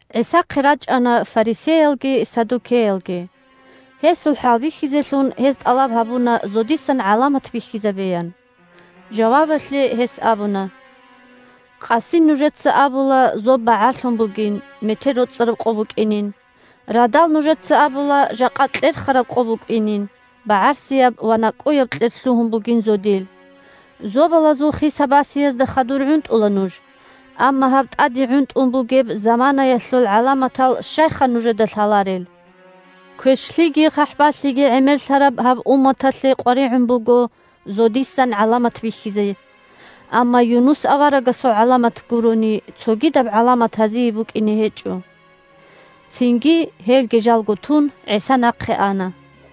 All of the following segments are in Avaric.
ГӀисахъе рачӀана фарисеялги саддукеялги. Гьесул хӀалбихьизелъун гьез тӀалаб гьабуна зодисан гӀаламат бихьизабеян. Жавабалъе гьес абуна: – Къаси нужеца абула зоб багӀарлъун бугин, метер роцӀараб къо букӀинин. Радал нужеца абула жакъа кьерхараб къо букӀинин, багӀарсияб ва накӀкӀуяб кьер лъугьун бугин зодил. Зобалазул хиса-басиязда хадур гӀунтӀула нуж, амма гьаб тӀаде гӀунтӀун бугеб заманаялъул гӀаламатал щайха нужеда лъаларел? Квешлъиги хъахӀбалъиги гӀемерлъараб гьаб умматалъе къваригӀун буго зодисан гӀаламат бихьизе. Амма Юнус аварагасул гӀаламат гурони, цогидаб гӀаламат гьазие букӀине гьечӀо. Цинги, гьелги жалго тун, ГӀиса нахъе ана.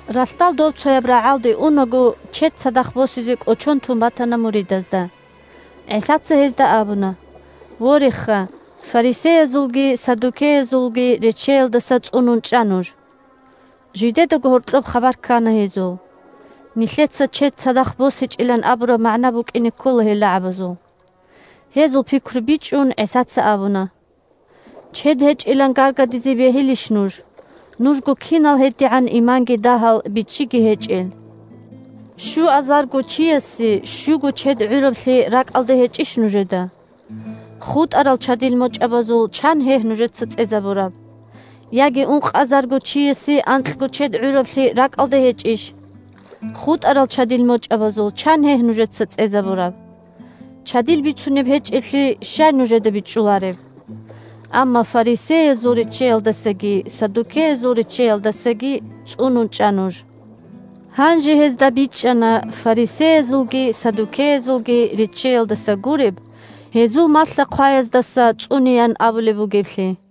Ралъдал добцояб рагӀалде унаго, чед цадахъ босизе кӀочон тун батана муридазда. ГӀисаца гьезда абуна: – Вореха, фарисеязулги саддукеязулги реччеялдаса цӀунун чӀа нуж. Жидедаго гьоркьоб хабар ккана гьезул: «Нилъеца чед цадахъ босичӀилан абураб магӀна букӀине ккола гьел рагӀабазул». Гьезул пикру бичӀчӀун, ГӀисаца абуна: – Чед гьечӀилан гаргадизе бегьилищ нуж? Нужго кинал гьединал иманги дагьал, бичӀчӀиги гьечӀел! Щуазарго чиясе щуго чед гӀураблъи ракӀалда гьечӀищ нужеда? ХутӀарал чадил мочӀабазул чан гьегь нужеца цӀезабураб? Яги ункъазарго чиясе анкьго чед гӀураблъи ракӀалда гьечӀищ? ХутӀарал чадил мочӀабазул чан гьегь нужеца цӀезабураб? Чадил бицунеб гьечӀеблъи щай нужеда бичӀчӀулареб? Амма фарисеязул реччеялдасаги саддукеязул реччеялдасаги цӀунун чӀа нуж! Гьанже гьезда бичӀчӀана фарисеязулги саддукеязулги реччеялдаса гуреб, гьезул малъа-хъваяздаса цӀунеян абулеб бугеблъи.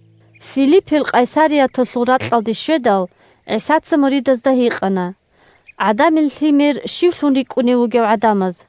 Филиппил Къайсарияталъул ракьалде щведал, ГӀисаца муридазда гьикъана: – ГӀадамил Лъимер щивлъун рикӀкӀунев вугев гӀадамаз?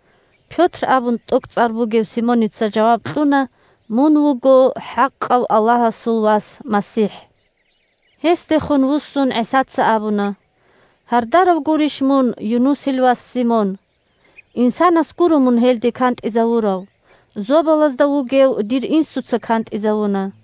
Пётр абун тӀокӀцӀар бугев Симоница жаваб кьуна: – Мун вуго хӀакъав Аллагьасул Вас МасихӀ! Гьесдехун вуссун ГӀисаца абуна: – Гьардарав гурищ мун, Юнусил вас Симон. Инсанас гуро мун гьелде кантӀизавурав, зобалазда вугев дир Инсуца кантӀизавуна.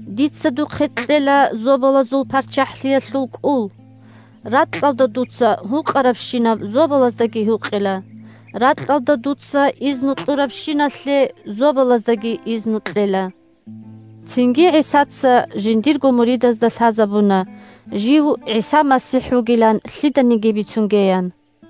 Дица духъе кьела Зобалазул ПарччахӀлъиялъул кӀул, ракьалда дуца гьукъарабщинаб зобалаздаги гьукъила, ракьалда дуца изну кьурабщиналъе зобалаздаги изну кьела. Цинги ГӀисаца жиндирго муридазда лъазабуна жив ГӀиса МасихӀ вугилан лъиданиги бицунгеян.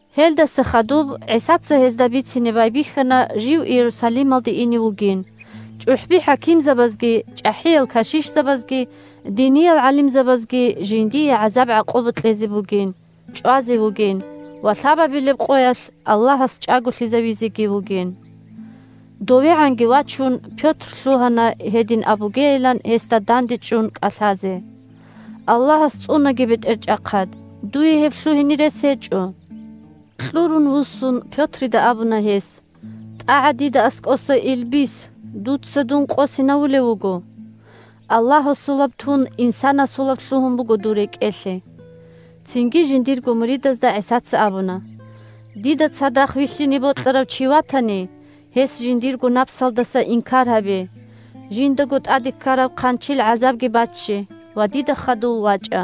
Гьелдаса хадуб ГӀисаца гьезда бицине байбихьана жив Иерусалималде ине вугин, чӀухӀби-хӀакимзабазги, чӀахӀиял кашишзабазги, диниял гӀалимзабазги жиндие гӀазаб-гӀакъуба кьезе бугин, чӀвазе вугин ва лъабабилеб къоялъ Аллагьас чӀаголъизавизеги вугин. ДовегӀанги вачун Пётр лъугьана гьедин абугейилан гьесда дандечӀун кӀалъазе: – Аллагьас цӀунаги, БетӀерчӀахъад! Дуе гьеб лъугьине рес гьечӀо! Кьурун вуссун, Пётрида абуна гьес: – ТӀагӀа дида аскӀоса, илбис! Дуца дун къосинавулев вуго! Аллагьасулаб тун инсанасулаб лъугьун буго дур рекӀелъе. Цинги жиндирго муридазда ГӀисаца абуна: – Дида цадахъ вилълъине бокьарав чи ватани, гьес жиндирго напсалдаса инкар гьабе, жиндаго тӀаде ккараб хъанчил гӀазабги бачче ва дида хадув вачӀа.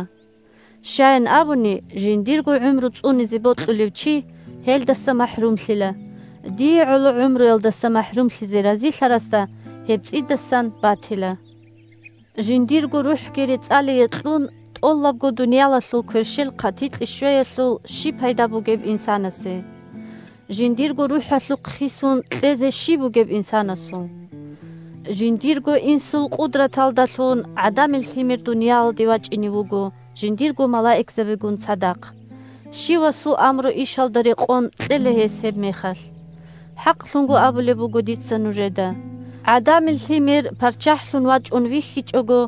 Щаян абуни, жиндирго гӀумру цӀунизе бокьулев чи гьелдаса махӀрумлъила, дие гӀоло гӀумруялдаса махӀрумлъизе разилъарасда гьеб цӀидасан батила. Жиндирго рухӀги рецӀалие кьун, тӀолабго дуниялалъул кверщел хъатикье щвеялъул щиб пайда бугеб инсанасе? Жиндирго рухӀалъухъ хисун кьезе щиб бугеб инсанасул? Жиндирго Инсул къудраталдалъун, ГӀадамил Лъимер дуниялалде вачӀине вуго жиндирго малаикзабигун цадахъ. Щивасул амру-ишалда рекъон кьела Гьес гьебмехалъ. ХӀакълъун абулеб буго дица нужеда: ГӀадамил Лъимер ПарччахӀлъун вачӀун вихьичӀого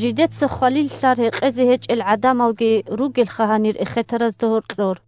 жидеца хвалил лълъар гьекъезе гьечӀел гӀадамалги ругелха гьанир эхетаразда гьоркьор.